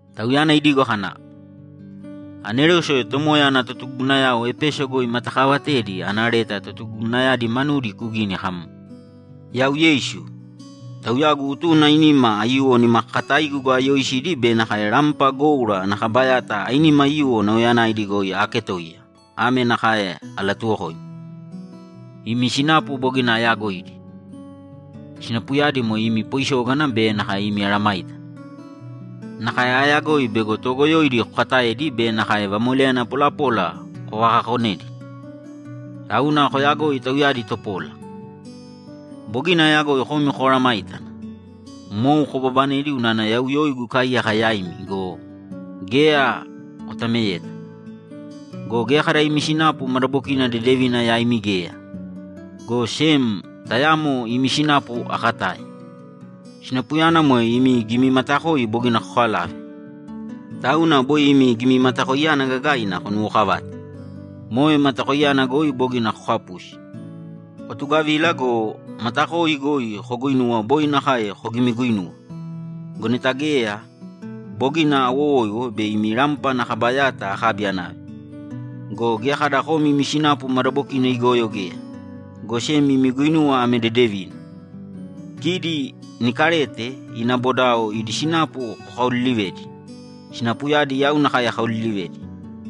Tauyana idigo kana, ‘Anerose Tomoya ana totugugunayao Epeso goi imatakaavatedi ana leta totugugunayadi manudi kugīni kam, “Yau Yeisu, Tauyagu utuna ainima aiyuwo nimakakataigu goi ayooisidi be nakae rampa goura ana kaba yata ainima aiyuwo nauyayanaidi goi aaketoiya, ame nakae alatuwokoimi: Imi sinapu bogina ayaagoidi. Sinapuyadi moe imi poisógana be nakae imi mesayágana. Nakae aayagoi bego toogoyoidi kokataedi be nakae vamoleyana polapola kovakakonedi, tauna koyagoi tauyadi topola. Bogina aayagoi komi komesayágana. Mou kobabanedi unana yau yoigu ikaaiyaka yaimi go, geya kotameyeta. Go geya kada imi sinapu madabokina dedevina yaimi geya, go sem tayamo imi sinapu akatae. Sinapuyana moe imi gimimatakoi bogina kokalave. Tauna boi imi gimimatakoiyana gagaina konuwookavāte; moe matakoiyana goi bogina kokapusi. Kotugavīla go, matakoi goi koguuinūwa boi nakae kogimiguinuwa. Go neta geya, bogina awowoiwo bei imi rampa ana kaba yata akabi anave. Go geya kada komi imi sinapu madabokina igoyo geya, go sem imi guinuwa ame dedevina: Kidi Nikalete ina bodao idi sinapu kokaoliilivedi. Sinapuyadi yau nakae akaoliilivedi.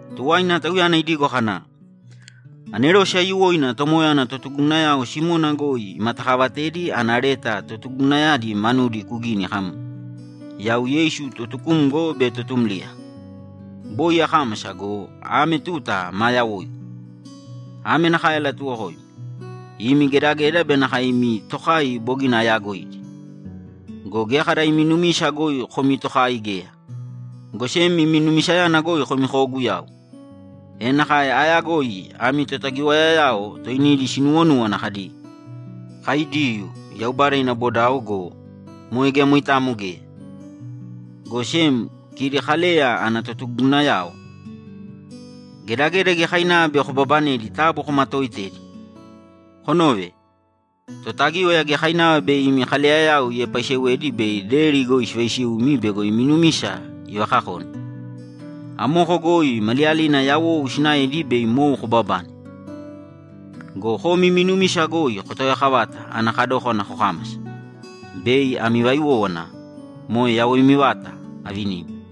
Tuwaina Tauyana idigo kana, ‘Anerose aiyuwoina Tomoya ana totugugunayao Simona goi imatakaavatedi ana leta totugugunayadi manudi kugīni kam, “Yau Yeisu Totukumgo be Totumliya, boi akámasa go, ame tuta maa yawoigu. Ame nakae alatuwokoimi: Imi gedageda be nakae imi tokai bogina ayaagoidi. Go geya kada imi numisa goi komi tokai geya, go sem imi numisayana goi komi kooguyau. E nakae aayagoi ami totagiwayayao toinidi sinuwonúwana kadi, ‘Kai Diyuu, Yaubada ina bodao’ go, moe geya moitamo geya, go sem kidi Kaleya ana totugugunayao! Gedageda giyakainava bei kobabanedi taabu komatooitēdi. Konōve! Totagíwaya giyakainava bei imi kaleyayao iepaaisewedi bei deri goi sivaisiumi bego imi numisa ivakakone. Amoko goi maliyalina yawou sinaedi bei mou kobabane. Go komi imi numisa goi kotaoyakavāta ana kadókana kokámasa, bei ami vaiwówana, moe yawoimi vata, avinimi.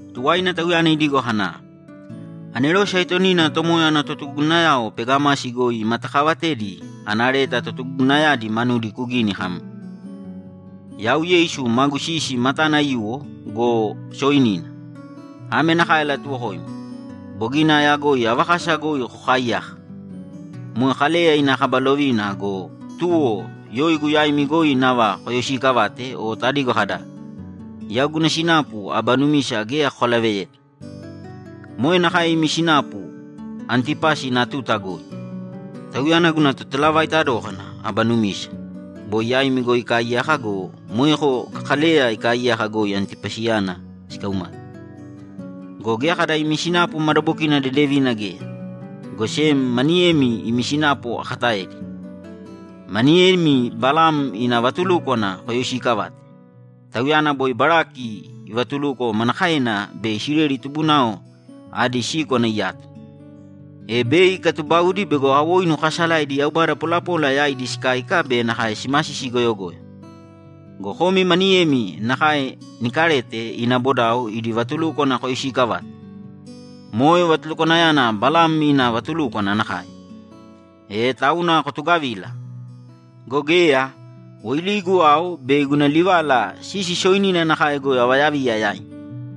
Tuwaina Tauyana idigo kana, ‘Anerose aitonina Tomoya ana totugugunayao Pegamasi goi imatakaavatedi ana leta totugugunayadi manudi kugīni kam, “Yau Yeisu magu sisi matana aiyuwo go, sooinina. Ame nakae alatuwokoimi: Bogina aayagoi ava kasa goi kokaaiyaka. Moe Kaleya ina kaba lovina go, tuwo yoigu yaimi goi nava koyoisiikavate o tadigo kada, ‘Yau guna sinapu aba numisa geya kokalaveyeta.’ Moe nakae imi sinapu Antipasi ina tuta goi. Tauyana guna totalavaita dókana aba numisa, boi yaimi goi ikaaiyaka go, moeko Kaleya ikaaiyaka goi Antipasiyana sikaumate. Go geya kada imi sinapu madabokina dedevina geya, go sem maniyemi imi sinapu akataedi. Maniyemi Balam ina vatulúkwana koyoisiikavate. Tauyana boi Balaki ivatuluko manakaena bei Isileli tubunao adi síkwana iyato, e bei ikatubaudi bego awoinu kaasalaidi yaubada polapola yaidi sikáika be nakae simasisi goyogoyo. Go komi maniyemi nakae Nikalete ina bodao idi vatulúkwana koyoisiikavate. Moe vatulukwanayana Balam ina vatulúkwana nakae. E tauna kotugavīla! Go geya, woiligu ao bei guna livala sisi sooinina nakae goi avayaviya yaimi.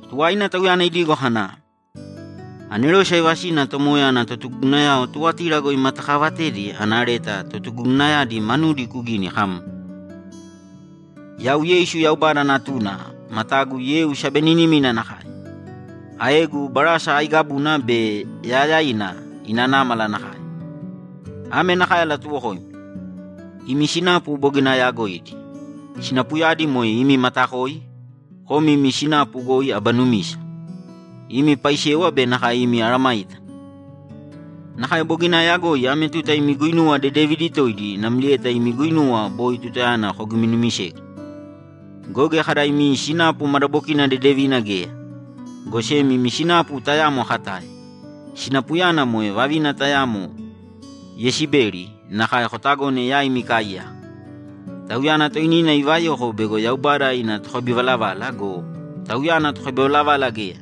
Tuwaina Tauyana idigo kana, ‘Anerose aivasina Tomoya ana totugugunayao Tuwatira goi imatakaavatedi ana leta totugugunayadi manudi kugīni kam, “Yau Yeisu Yaubada Natuna matagu yeu sabeninimina nakae. Aegu barasa aiigabuna be yaayaina ina námala nakae. Ame nakae alatuwokoimi: Imi sinapu bogina ayaagoidi. Sinapuyadi moe imi matakoi, komi imi sinapu goi aba numisa, imi paisewa be nakae imi mesayágana. Nakae bogina aayagoi ame tuta imi guinuwa dedevidi toidi namlieta imi guinuwa boi tutayana kogiminumisegu. Go geya kada imi sinapu madabokina dedevina geya, go sem imi sinapu tayamo akatae. Sinapuyana moe vavina tayamo Yesibeli nakae kotagone yaimi ikaaiyaka. Tauyana toinina ivayoko bego Yaubada ina tokabivalavala go, tauyana tokabivalavala geya.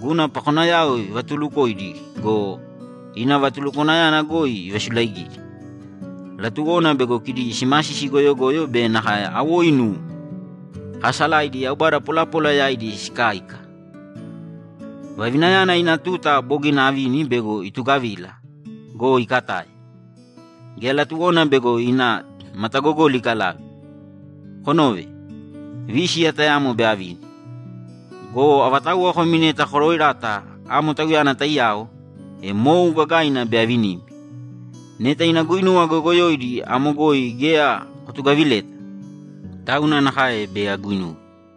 Guna pakonayao ivatulukoidi go, ina vatulukwanayana goi ivasulaigidi; latuwona bego kidi simasisi goyogoyo be nakae awoinu kaasalaidi yaubada polapola yaidi sikáika. Vavinayana ina tuta bogina avini bego itugavila go, ikatae; geya latuwona bego ina matagogoli ikalave. Konōve! Vísiya tayamo bei avini. Go avatauwa komi neta koroerata amo tauyana taiyao, e mou gagaina bei avinimi. Neta ina guinuwa goyogoyoidi amo goi geya kotugavileta, tauna nakae bei aguinuwe.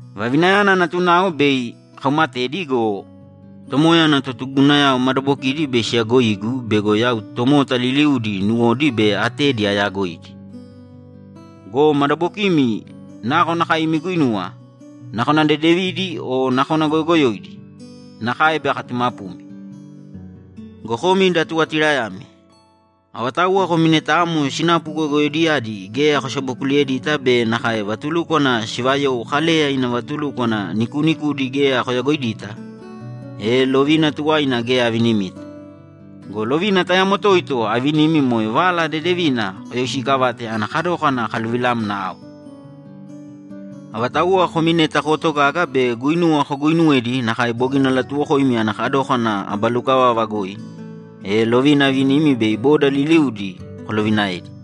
Vavinayana natunao bei akaumatedi go, Tomoya ana totugugunayao madabokidi bei siyagoigu bego yau tomota liliudi nuwodi be atedi ayaagoidi. Go madabokimi nakonakae imi guinuwa, nakona dedevidi o nakona goyogoyoidi, nakae bei akatumapumi. Go komi da Tuwatirayami, avatauwa komi neta amo sinapu goyogoyoidiyadi geya kosabokuliyedita be nakae vatulúkwana sivayou Kaleya ina vatulúkwana nikuunikudi geya koyagoidita, e lovina tuwaina geya avinimita. Go lovina tayamo toito avinimi moe Vala Dedevina koyoisiikavāte ana kadókana akaluvilamna ao. Avatauwa komi neta kootogaga be guinuwa koguuinuwedi nakae bogina alatuwokoimi ana kadókana aba lukavava goi, e lovina avinimi bei boda liliudi kolovinaedi.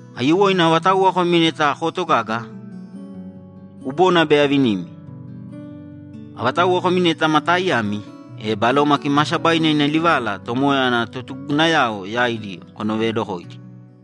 Aiyuwoina avatauwa komi neta kootogaga, kubona bei avinimi. Avatauwa komi neta ma taaiyami, e Baloma Kimaasabaina ina livala Tomoya ana totugugunayao yaidi konoveedokōidi!”’